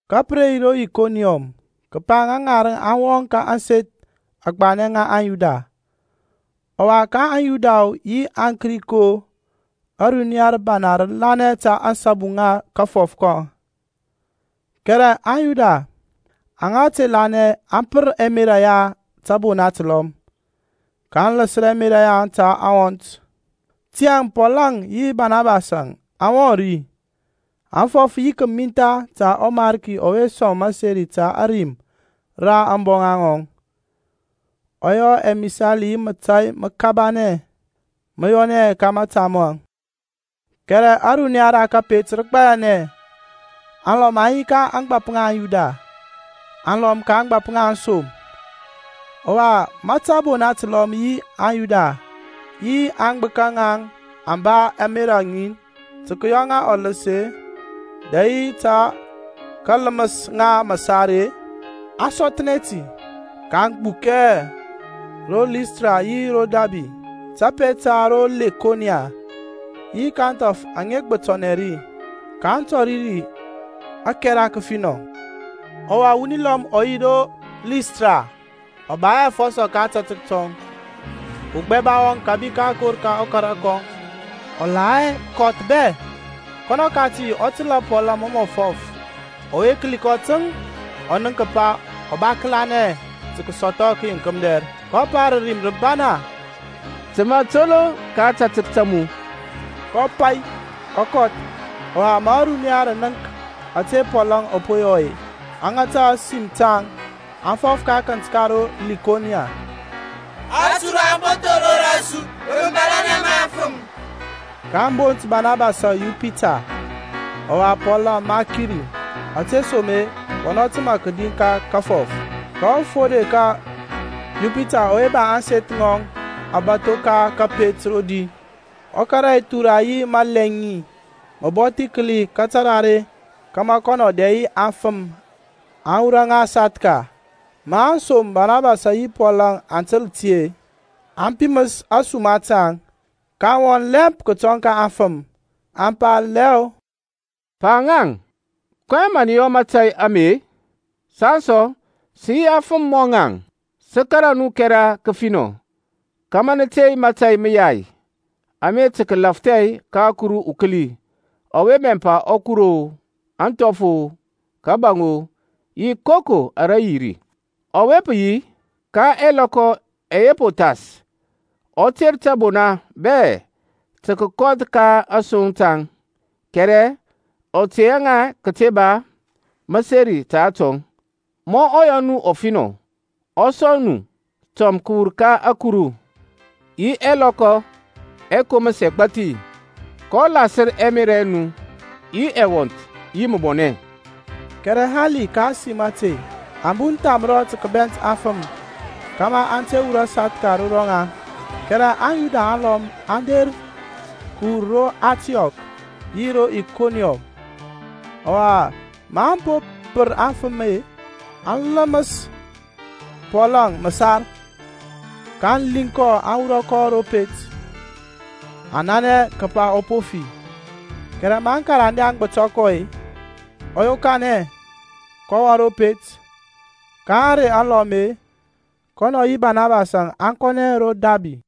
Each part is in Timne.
Ka pə re yi ro Ikoniɔm, kəpa ŋa ŋarəŋ aŋ wɔŋ ka ȧŋseth agbanɛ ŋa aŋYuda, ɔwa ka aŋYuda-o yi aŋKrik-o, ȧruniya rəbana rə lanɛ ta ȧŋsabu ŋa kafɔf ka ŋaŋ. Kɛrɛ aŋYuda aŋa te lanɛ aŋ pər ɛmerȧ ya tȧbona təlɔm, kaŋ ləsər ɛmerȧ yaŋ ta aŋwɔnt. Tiyȧŋ Pɔlȧŋ yi Banabasȧŋ aŋ wɔŋ ri, aŋ fɔf yi kəmintha ta ɔMarki ɔwe sɔŋ məseri ta ȧrim ra ȧŋboŋa ŋɔŋ, ɔ yɔ ɛmisali yi mȧtȧy məkabanɛ mə yɔnɛ ka mȧta maŋ. Kɛrɛ ȧruniya ra kȧpet rə gbayanɛ; alɔm aŋ yi ka ȧŋgbȧp ŋa aŋYuda, aŋlɔm ka ȧŋgbȧp ŋa aŋsom. Ɔwa ma tȧbona təlɔm yi aŋYuda yi aŋgbəka ŋaŋ aŋ ba ȧmerȧ ŋin tə kəyɔ ŋa ɔləs-e, dɛ yi tə kələməs ŋa məsar-e, Maŋ sɔthnɛ ti, kaŋ gbukɛ ro Listra yi ro Dabi, təpet ta ro Lekonia, yi ka ȧŋthɔf aŋa gbətɔnɛ ri. kaŋ tɔri ri ȧkɛra kəfinɔ. Ɔwa wuni lɔm ɔ yi ro Listra, ɔ ba hɛ afɔsɔ ka ȧtȧtək tɔŋ, ugbɛba wɔŋ kȧbi ka akor ka ɔkara kɔŋ, ɔ la hɛ kɔth bɛ. Kɔnɔ kati ɔ təlȧ Pɔlȧŋ mɔ mɔ fɔf; ɔwe kəli kɔ təŋ, ɔ nənk kəpa ɔ ba kəlanɛ tə kəsɔthɔ kəyeŋk mədɛr, kɔ pa rə rim rəbana, Təmȧ toloŋ ka ȧtȧtək ta mu. Kɔ pai, ɔ kɔth. Ɔwa ma ȧruniya rə nənk ȧtȧ Pɔlȧŋ ɔ po yɔ-e, aŋ ŋata ȧsim taŋ, aŋ fɔf ka akənt ka ro Lekonia, Aturu aŋ po thor ro rɔsu rə mȧbȧlȧnɛ ma afəm. kaŋ bont Banabasȧŋ Yupita, ɔwa Pɔlȧŋ Mərkuri, ȧtesoma-e kɔnɔ təmȧ kədi ka kafɔf. Ka ɔfode ka Yupita ɔwe ba ȧŋseth ŋɔŋ abȧtho ka kȧpet rodi, ɔ kȧrȧ ɛthura yi məlɛŋi məbɔthi kəli ka tarare kȧmȧ kɔnɔ dɛ yi aŋfəm aŋ wurɔ ŋa sathka. Ma aŋsom Barnabas yi Pɔl aŋ təl ti-e, aŋ piməs ȧsuma taŋ, kaŋ wɔŋ lɛmp kətɔŋ ka aŋfəm, aŋ pa lɛɔ, Pa-ŋaŋ, kɔyɛŋ mə nə yɔ mȧtȧy ame-e? Saŋ sɔ sə yi afəm mɔ naŋ, sə kȧrȧ nu kɛra kəfinɔ kȧmȧ nə tey mȧtȧy məyai ame tə kəlafthɛ ka ɔKuru ukəli ɔwe bɛmpa akuru-o, anthɔf-o, kȧbȧŋ-o yi koko ara yi ri. Ɔwe pə yi, ka ɛlɔkɔ ɛyɛ po thas ɔ ter tȧbona bɛ tə kəkɔth ka asoŋ taŋ. Kɛrɛ ɔ tey hɛ ŋa kəte ba məseri ta atɔŋ, ma ɔ yɔ nu ɔfinɔ, ɔ sɔŋ nu tɔm kəwur ka ȧkuru yi ɛlɔkɔ ɛkoməs ɛgbathi, kɔ lasər ɛmerȧ ɛ nu yi ɛwɔnth yi məbɔnɛ. Kɛrɛ hali ka ȧsim ȧte aŋ bun thamrɔ tə kəbɛnt aŋfəm kȧmȧ aŋ te wurɔ sathka ro rɔŋaŋ. Kɛrɛ aŋYuda alɔm aŋ der kəwur ro Antiɔk yi ro Ikoniɔm; ɔwa maŋ po pər aŋfəm-e, aŋ ləməs Pɔlȧŋ məsar, kaŋ liŋ kɔ aŋ wurɔ kɔ ro pet, aŋ nanɛ kəpa ɔ po fi. Kɛrɛ ma aŋkarande aŋ gbətɔ kɔ-e, ɔ yokanɛ, kɔ wɔŋ ro pet. Ka ȧŋrey alɔm-e, kɔnɔ yi Banabasȧŋ aŋ kɔnɛ ro Dabi.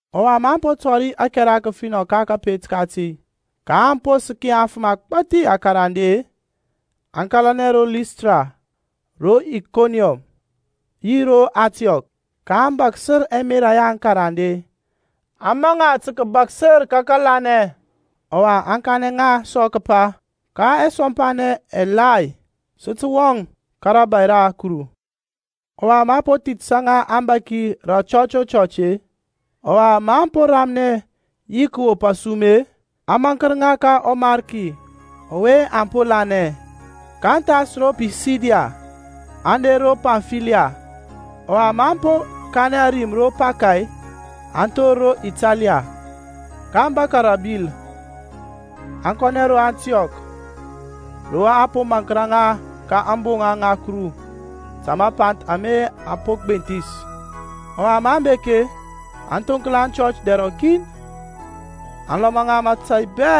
Ɔwa maŋ po tɔri ȧkɛra kəfinɔ ka kȧpet kati, ka aŋ po səki afəm agbȧthi akarande-e, aŋ kȧlanɛ ro Listra, ro Ikoniɔm yi ro Antiɔk. kaŋ bȧksər ɛmerȧ ya aŋkarande, aŋ maŋ ŋa tə kəbasər ka kȧlanɛ, ɔwa aŋ kanɛ ŋa sɔ kəpa, ka ɛsɔmpanɛ ɛgbathi sə tə wɔŋ ka rȧbȧy ra Kuru. lƆwa maŋ po thithəsȧ ŋa abȧki rə ȧchɔch o chɔch-e, ɔwa maŋ po ramnɛ yi kəwop asum-e, aŋ maŋkər ŋa ka ɔMarki ka ɔwe aŋ po lanɛ. kaŋ thas ro Pisidiya, aŋ der ro Pamfiliya. Ɔwa maŋ po kanɛ ȧrim ro Paka-e aŋ thor ro Ataliya. kaŋ bȧkȧ ri rə abil, aŋ kɔnɛ ro Antiɔk ro a po maŋkər ŋa ka ȧŋboŋa ŋa Kuru ta mapanth ama aŋ po gbenthis. Ɔwa maŋ bek-e, aŋ thoŋkla aŋchɔch dɛr rɔkin, aŋ lɔma ŋa mȧtȧy bɛ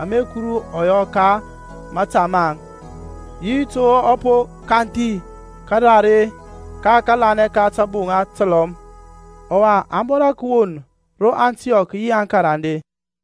ama Kuru ɔ yɔ ka mȧta maŋ, yi to ɔ po kanthi karare ka kȧlanɛ ka tȧbona təlɔm. Ɔwa aŋ bora kəwon ro Antiɔk yi aŋkarande.